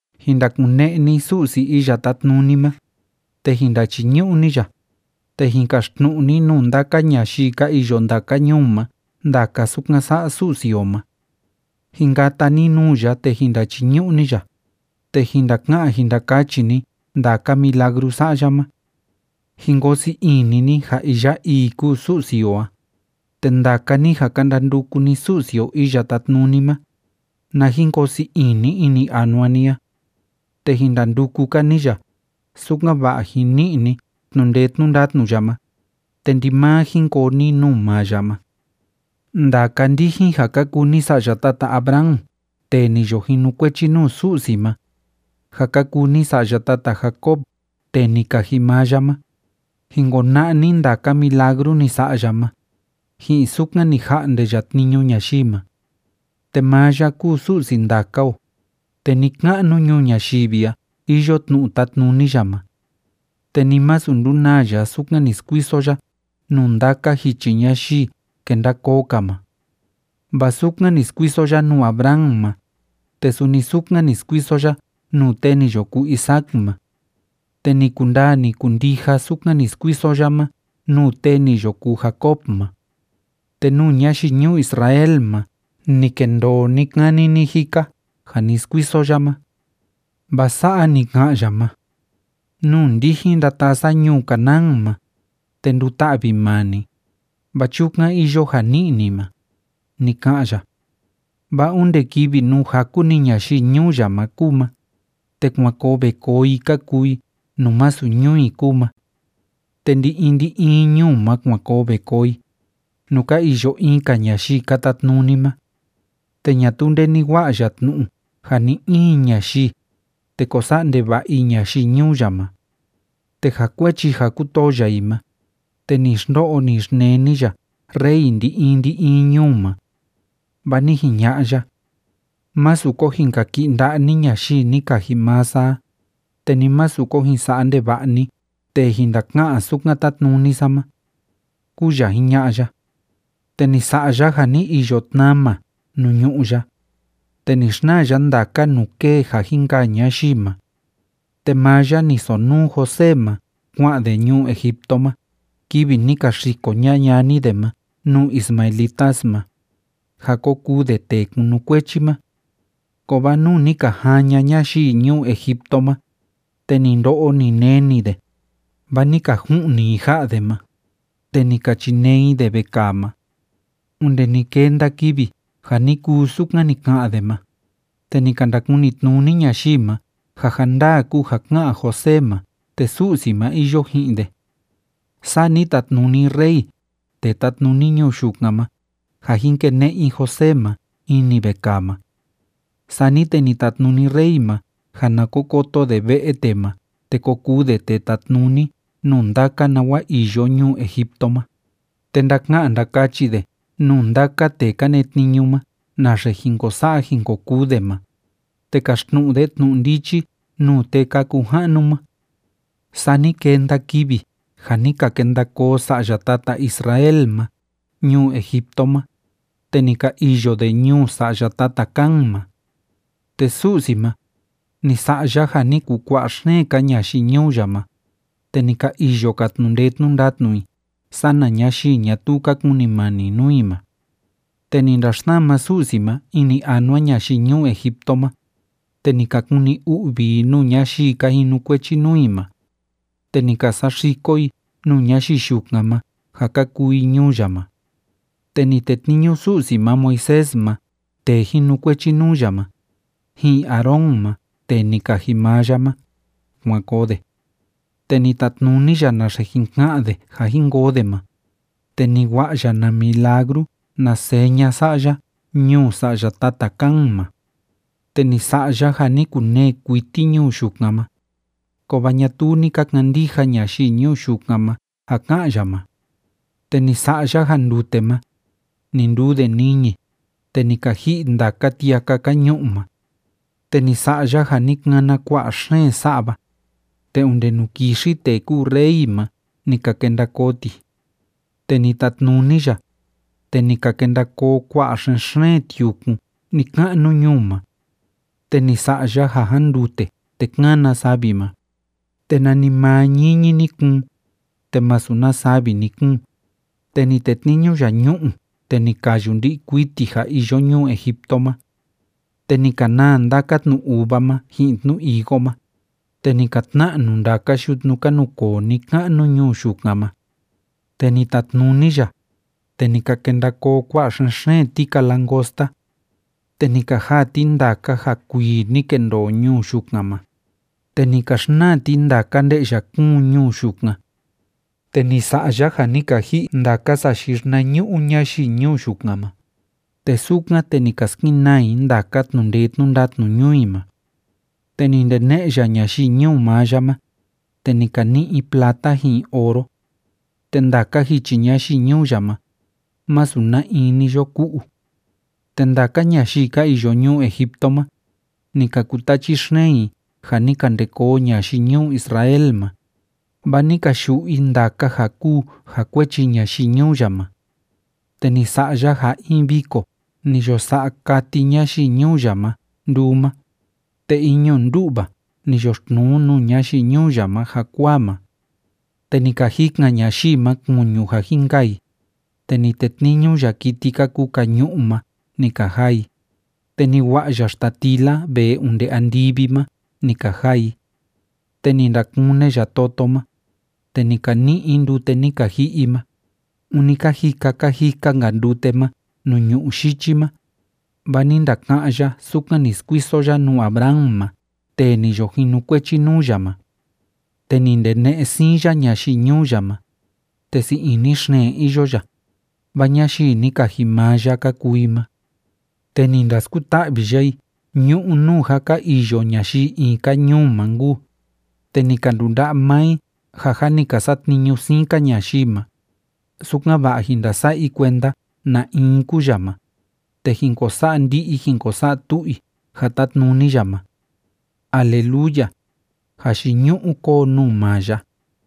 Jin ndakune'e ni Su'si Iya Tátnuni ma, te jin ndachiñu'u ni ya, te jin kaxtnu'u ni nuu ndaka ñayii ka iyo ndaka ñuu ma ndaka sukan sa'a Su'si o ma. Jin kata ni nuu ya, te jin ndachiñu'u ni ya, te jin ndaka'an jin ndakachi ni ndaka milagru sa'a ya ma. Jin koo sii ini ni ja iya ii kúu Su'si o a, te ndaka ni ja ka ndanduku ni Su'si o Iya Tátnuni ma, na jin koo sii ini ini anua ni a. Te jin ndanduku‑ka ni ya, sukan‑va'a jin ni'i ni tnu'u ndee tnu'u ndatnu ya ma, te ndimaa jin koo ni nuu maa ya ma. Ndaka ndijin ja ka kuu ni sa'ya tata Abraham tee ni yo jinukuechi nuu Su'si ma, ja ka kuu ni sa'ya tata Jacob tee ni kaji maa ya ma, jin kona'a ni ndaka milagru ni sa'a ya ma, ji'in sukan ni ja'nde ya tniñu ñayii ma. Te maa ya kúu Su'si ndaka o, te ni‑ka'nu ñuu ñayivi a iyo tnu'u tátnuni ya ma. Te ni masu ndunaa ya sukan ni skuiso ya nuu ndaka jichi ñayii kenda koo‑ka ma. Vaa sukan ni skuiso ya nuu Abraham ma, te suni sukan ni skuiso ya nuu tee ni yo kuu Isaac ma. Te ni kundaa, ni kundija sukan ni skuiso ya ma nuu tee ni yo kuu Jacob ma. Te nuu ñayii ñuu Israel ma ni kendoo ni‑kani ni‑jika ja ni skuiso ya ma. Vaa sa'a ni ka'an ya ma: “Nuu ndijin ndataa sa ñuu Canaán ma, te nduta'vi maa ni, vaa chukan iyo ja ni'i ni ma”, ni ka'an ya. Vaa onde kivi nuu jaku‑ni ñayii ñuu ya ma kúu ma, te kuan koo ve koo ka kuu i nuu masu ñuu i kúu ma. Te ndi‑in ndi‑in ñuu ma kuan koo ve koo i, nuu ka iyo in‑ka ñayii ka tatnuni ma. Te ñatuu nde ni wa'a ya tnu'u ja ni‑in ñayii, te ko sa'a ndeva'a i ñayii ñuu ya ma. Te ja kuechi ja kútoo ya i ma, te ni xndo'o ni xneni ya rey ndi‑in ndi‑in ñuu ma. Vaa ni jiña'a ya: “Masu ko jin kaki'i nda'a ni ñayii ni kaji maa sa a, te ni masu ko jin sa'a ndeva'a ni tee jin ndaka'an sukan tátnuni sa ma”, kúu ya jiña'a ya. Te ni sa'a ya ja ni iyo tnama nuu ñu'ú ya, te ni xnaa ya ndaka nuu kée ja jin kaa ñayii ma. Te maa ya ni sonuu José ma kua'an de ñuu Egipto ma kivi ni ka xiko ña'a ñani de ma nuu ismaelitas ma, ja ko kuu de tee kunukuechi ma. Kovaa nuu ni ka jaan ña'a ñayii ñuu Egipto ma, te ni ndo'o, ni neni de, vaa ni ka ju'ni i ja'a de ma, te ni ka chinee i de vekaa ma. Onde ni kenda kivi ja ni kuu sukan ni ka'an de ma, te ni ka ndakuni tnuni ñayii ma ja ja ndaa kúu ja ká'an José ma te Su'si ma iyo ji'in de. Saa ni tatnuni rey tee tátnuni ñuu yukan ma ja jín kene'e i José ma ini vekaa ma. Sani te ni tatnuni rey ma ja na ko koto de ve'e tee ma te ko kuu de tee tatnuni nuu ndaka nawa iyo ñuu Egipto ma, te ndaka'an ndakachi de nuu ndaka tee ka netniñu ma naxe jin ko sa'a jin ko kuu de ma, te kaxtnu'u de tnu'u ndichi nuu tee ka kuu ja'nu ma. Saa ni kenda kivi ja ni ka kenda koo sa'ya tata Israel ma ñuu Egipto ma, te ni ka iyo de ñuu sa'ya tata Cam ma. Te Su'si ma, ni sa'a ya ja ni kukua'a xeen‑ka ñayii ñuu ya ma, te ni ka iyo‑ka tnu'u ndee tnu'u ndatnu i sana ñayii ñatuu ka kunimani nuu i ma. Te ni ndaxsama Su'si ma ini anua ñayii ñuu Egipto ma, te ni ka kuni u'vi i nuu ñayii ka jinukuechi nuu i ma, te ni ka saxiko i nuu ñayii yukan ma ja ka kuu i ñuu ya ma. Te ni tetniñu Su'si ma Moisés ma tee jinukuechi nuu ya ma, ji'in Aarón ma tee ni kaji maa ya ma, kuan koo de. Te ni tatnuni ya naxe jin ka'an de ja jin koo de ma, te ni wa'a ya na milagru na seña sa'a ya ñuu sa'ya tata Cam ma. Te ni sa'a ya ja ni kunee kuiti ñuu yukan ma, kovaa ñatuu ni ka kandija ñayii ñuu yukan ma ja ká'an ya ma. Te ni sa'a ya ja ndute ma, ni nduu de niñi, te ni ka ji'i ndaka tiaka ka ñu'u ma. Te ni sa'a ya ja ni kana kua'a xeen sa'va, te onde nuu kixi tee kúu rey ma ni ka kenda koo ti. Te ni tatnuni ya, te ni ka kenda koo kua'a xen‑xeen tiukun ni‑ka'nu ñuu ma. Te ni sa'a ya ja jándute te kána savi ma, te nanimaa ñiñi ni kuun, te másu na savi ni kuun, te ni tetniñu ya ñu'u te ni kayu ndi'i kuiti ja iyo ñuu Egipto ma. Te ni ka naa ndaka tnu uva ma ji'in tnu higo ma, te ni ka tna'nu ndaka yutnu ka nukoo ni‑ka'nu ñuu yukan ma. Te ni tatnuni ya, te ni ka kenda koo kua'a xen‑xeen tika langosta. Te ni ka jaa ti ndaka ja kuii ni kendoo ñuu yukan ma, te ni ka xnaa ti ndaka nde'ya kúun ñuu yukan. Te ni sa'a ya ja ni ka ji'i ndaka sayii xinañu'u ñayii ñuu yukan ma, te sukan, te ni ka skenaa i ndaka tnu'u ndee tnu'u ndatnu ñuu i ma. Te ni ndene'e ya ñayii ñuu maa ya ma, te ni ka ni'i i plata ji'in oro. Te ndaka jichi ñayii ñuu ya ma, masu na in ni yo ku'u. Te ndaka ñayii ka iyo ñuu Egipto ma, ni ka kutachi xeen i ja ni ka nde koo ñayii ñuu Israel ma, vaa ni ka yu'u i ndaka ja kúu ja kuechi ñayii ñuu ya ma. Te ni sa'a ya ja in viko ni yo sa'a kati ñayii ñuu ya ma nduu ma, te in ñu'u ndu'va ni yoxtnuu nuu ñayii ñuu ya ma jakuaa ma. Te ni ka jikan ñayii ma kuñu ja jin kaa i, te ni tetniñu ya kiti ka kuu kañu'u ma ni ka jaa i, te ni wa'a ya xtatila vee onde andivi ma ni ka jaa i. Te ni ndakune ya toto ma, te ni ka ni'i i ndute ni ka ji'i i ma, ûni ka jika ka jika‑nka ndute ma nuu ñu'ú yichi ma. Vaa ni ndaka'án ya sukan ni skuiso ya nuu Abraham ma tee ni yo jinukuechi nuu ya ma. Te ni ndene'e sii ini ya ñayii ñuu ya ma, te sii ini xeen iyo ya, vaa ñayii ni kaji maa ya ka kuu i ma. Te ni ndaskuta'vi ya i ñu'ú nuu jâ ka iyo ñayii in‑ka ñuu ma nkuu, te ni ka ndunda'a maa i ja jâ ni ka satniñu siin‑ka ñayii ma, sukan‑va'a jín ndasa'a i kuenda na in kúu ya ma, te jín ko sa'a ndi'i jín ko sa'a tu'u i ja tátnuni ya ma. ¡Aleluya! ¡Jayiñu'u kóo nuu maa ya!